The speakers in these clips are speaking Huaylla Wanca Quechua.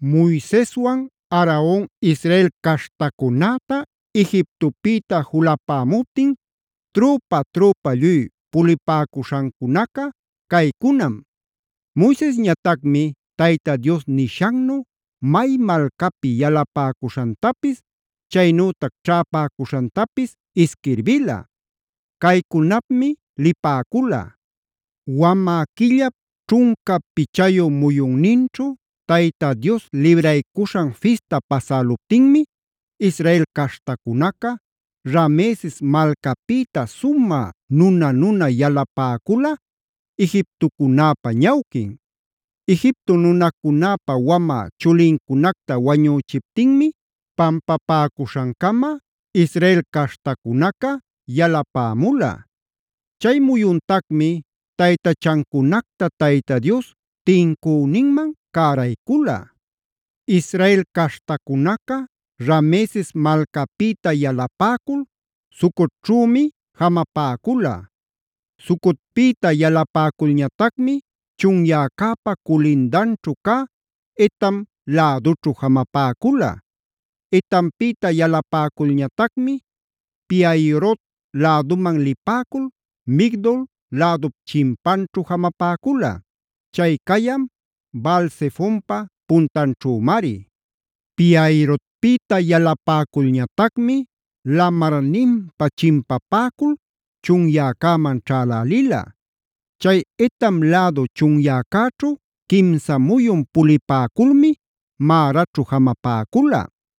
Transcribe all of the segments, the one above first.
Moiseswan Aaron Israel caśhtacunäta Egiptopïta julapämuptin trüpa-trüpa lluy pulipäcuśhancuna caycunam. Moisesñatacmi Tayta Dios nishannu may malcapi yalapäcuśhantapis, chaynütac ćhäpäcuśhantapis isquirbila. Caycunapmi lipäcula: Wamä quillap ćhunca pichayu muyunninćhu, Tayta Dios Libraycuśhan Fista pasäluptinmi Israel caśhtacunaca Rameses malcapïta sumä nuna-nuna yalapäcula, Egiptocunäpa ñawquin. Egipto nunacunäpa wamä chulincunacta wañüchiptinmi pampapäcuśhancama Israel caśhtacunaca yalapämula. Chay muyuntacmi taytachancunacta Tayta Dios tincüninman cäraycula. Israel caśhtacunaca Rameses malcapïta yalapäcul Sucotćhümi jamapäcula. Sucotpïta yalapäculñatacmi chunyäcäpa culindanćhu cä Etam lädućhu jamapäcula. Etampïta yalapäculñatacmi Pi-hahirot läduman lipäcul Migdol lädup chimpanćhu jamapäcula; chay cayan Baal-zefonpa puntanćhümari. Pi-hahirotpïta yalapäculñatacmi lamarninpä chimpapäcul chunyäcäman ćhälälila. Chay Etam lädu chunyäcäćhu quimsa muyun pulipäculmi Maraćhu jamapäcula.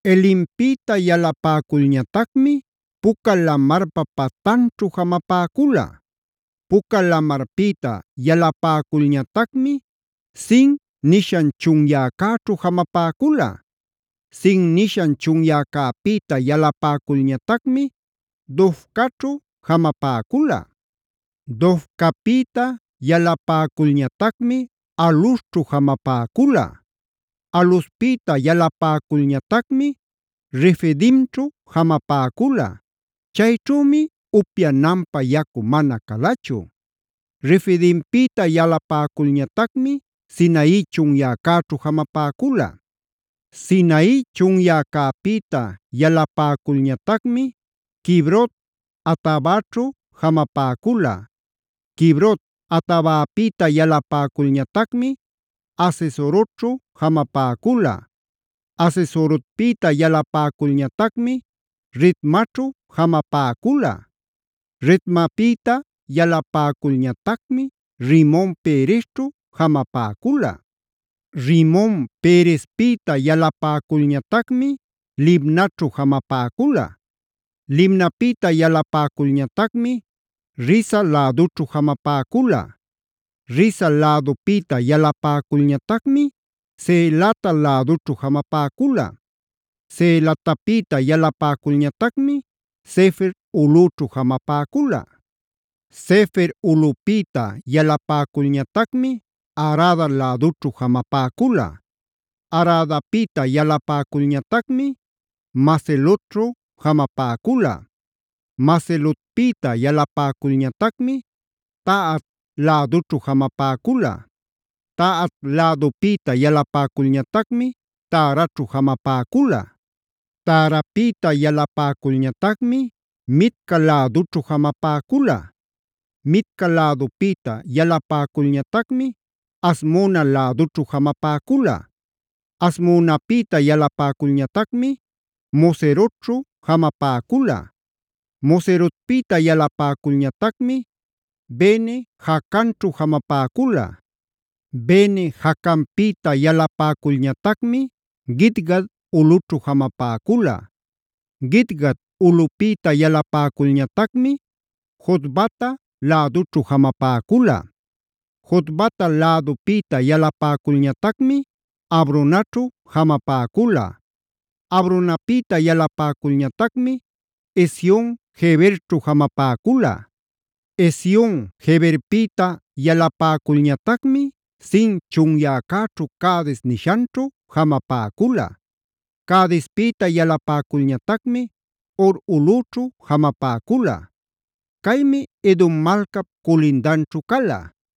Elimpïta yalapäculñatacmi Puca Lamarpa patanćhu jamapäcula. Puca Lamarpïta yalapäculñatacmi Sin nishan chunyäćhu jamapäcula. Sin nishan chunyäcäpïta yalapäculñatacmi Dofcaćhu jamapäcula. Dofcapïta yalapäculñatacmi Alusćhu jamapäcula. Aluspïta yalapäculñatacmi Refidimćhu jamapäcula. Chayćhümi upyananpä yacu mana calachu. Refidimpïta yalapäculñatacmi Sinai chunyäcäćhu jamapäcula. Sinai chunyäcäpïta yalapäculñatacmi Kibrot-hataavaćhu jamapäcula. Kibrot-hataavapïta yalapäculñatacmi Hazerotćhu jamapäcula. Hazerotpïta yalapäculñatacmi Ritmaćhu jamapäcula. Ritmapïta yalapäculñatacmi Rimon-peresćhu jamapäcula. Rimon-perespïta yalapäculñatacmi Libnaćhu jamapäcula. Libnapïta yalapäculñatacmi Rissa lädućhu jamapäcula. Rissa lädupïta yalapäculñatacmi Ceelata lädućhu jamapäcula. Ceelatapïta yalapäculñatacmi Sefer ulꞌüćhu jamapäcula. Sefer ulꞌüpïta yalapäculñatacmi Harada lädućhu jamapäcula. Haradapïta yalapäculñatacmi Macelotćhu jamapäcula. Macelotpïta yalapäculñatacmi Tahat lädućhu jamapäcula. Tahat lädupïta yalapäculñatacmi Taraćhu jamapäcula. Tarapïta yalapäculñatacmi Mitca lädućhu jamapäcula. Mitca lädupïta yalapäculñatacmi Hasmona lädućhu jamapäcula. Hasmonapïta yalapäculñatacmi Moserotćhu jamapäcula. Moserotpïta yalapäculñatacmi Bene-jaacanćhu jamapäcula. Bene-jaacanpïta yalapäculñatacmi Gidgad ulꞌućhu jamapäcula. Gidgad ulꞌupïta yalapäculñatacmi Jotbata lädućhu jamapäcula. Jotbata lädupïta yalapäculñatacmi Abronaćhu jamapäcula. Abronapïta yalapäculñatacmi Ezion-geberćhu jamapäcula. Ezion-geberpïta yalapäculñatacmi Zin chunyäcäćhu Cades nishanćhu jamapäcula. Cadespïta yalapäculñatacmi Hor ulꞌüćhu jamapäcula. Caymi Edom malcap culindanćhu cala.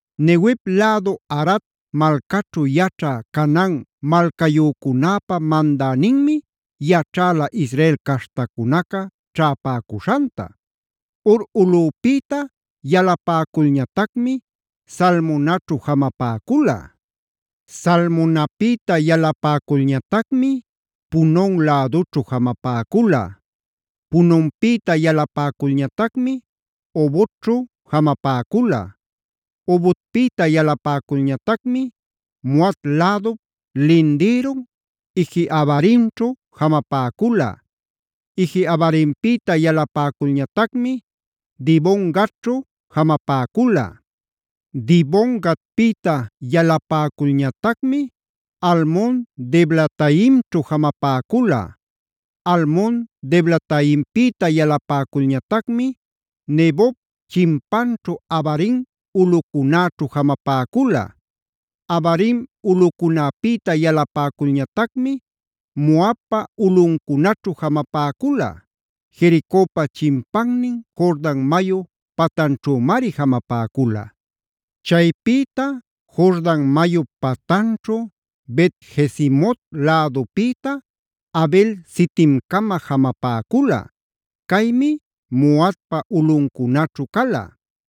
Neguev lädu Arad malcaćhu yaćhä Canaan malcayücunäpa mandäninmi yaćhäla Israel caśhtacunacab ćhäpäcuśhanta. Hor ulꞌupïta yalapäculñatacmi Zalmonaćhu jamapäcula. Zalmonapïta yalapäculñatacmi Punon lädućhu jamapäcula. Punonpïta yalapäculñatacmi Obotćhu jamapäcula. Obotpïta yalapäculñatacmi Moab lädup lindïrun Ije-abarimćhu jamapäcula. Ije-abarimpïta yalapäculñatacmi Dibon-gadćhu jamapäcula. Dibon-gadpïta yalapäculñatacmi Almon-diblataimćhu jamapäcula. Almon-diblataimpïta yalapäculñatacmi Nebop chimpanćhu Abarim ulꞌucunäćhu jamapäcula. Abarim ulꞌucunäpïta yalapäculñatacmi Moabpa ulꞌuncunaćhu jamapäcula; Jericopa chimpannin Jordan mayu patanćhümari jamapäcula. Chaypïta Jordan mayup patanćhu Bet-jesimot lädupïta Abel-sitimcama jamapäcula; caymi Moabpa ulꞌuncunaćhu cala.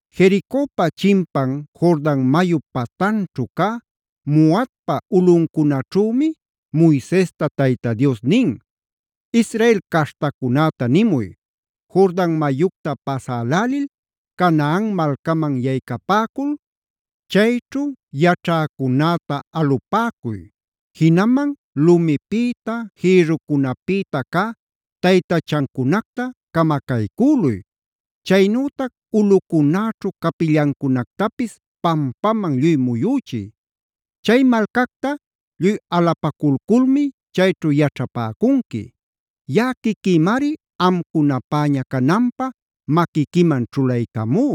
Jericopa chimpan Jordan mayup patanćhu cä Moabpa ulꞌuncunaćhümi Moisesta Tayta Dios nin: “Israel caśhtacunäta nimuy: ‘Jordan mayucta pasälälil Canaan malcaman yaycapäcul, chayćhu yaćhäcunäta alupäcuy. Jinaman lumipïta, jïrrucunapïta cä taytachancunacta camacaycüluy. Chaynütac ulꞌucunäćhu capillancunactapis pampaman lluy muyüchiy. Chay malcacta lluy alapaculculmi chayćhu yaćhapäcunqui; yaꞌa quiquïmari amcunapäña cananpä maquiquiman ćhulaycamú.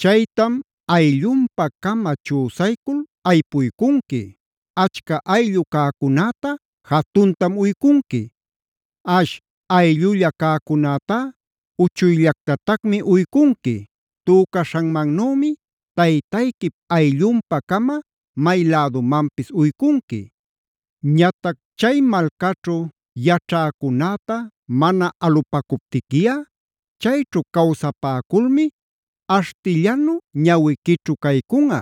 Chaytam ayllunpä-cama chüsaycul aypuycunqui. Achca ayllu cäcunäta jatuntam uycunqui; ash ayllulla cäcunätá uchuyllactatacmi uycunqui. Tücaśhanmannümi taytayquip ayllunpä-cama may lädumanpis uycunqui. Ñatac chay malcaćhu yaćhäcunäta mana alupäcuptiquiꞌa chayćhu cawsapäculmi aśhtillanu ñawiquićhu caycunꞌa,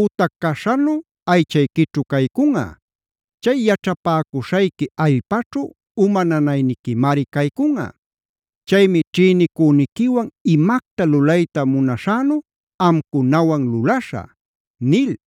ütac caśhanu aychayquićhu caycunꞌa. Chay yaćhapäcuśhayqui allpaćhu uma nanayniquimari caycunꞌa. Chaymi ćhïnicüniquiwan imacta lulayta munaśhänu amcunawan lulaśhä’” nil.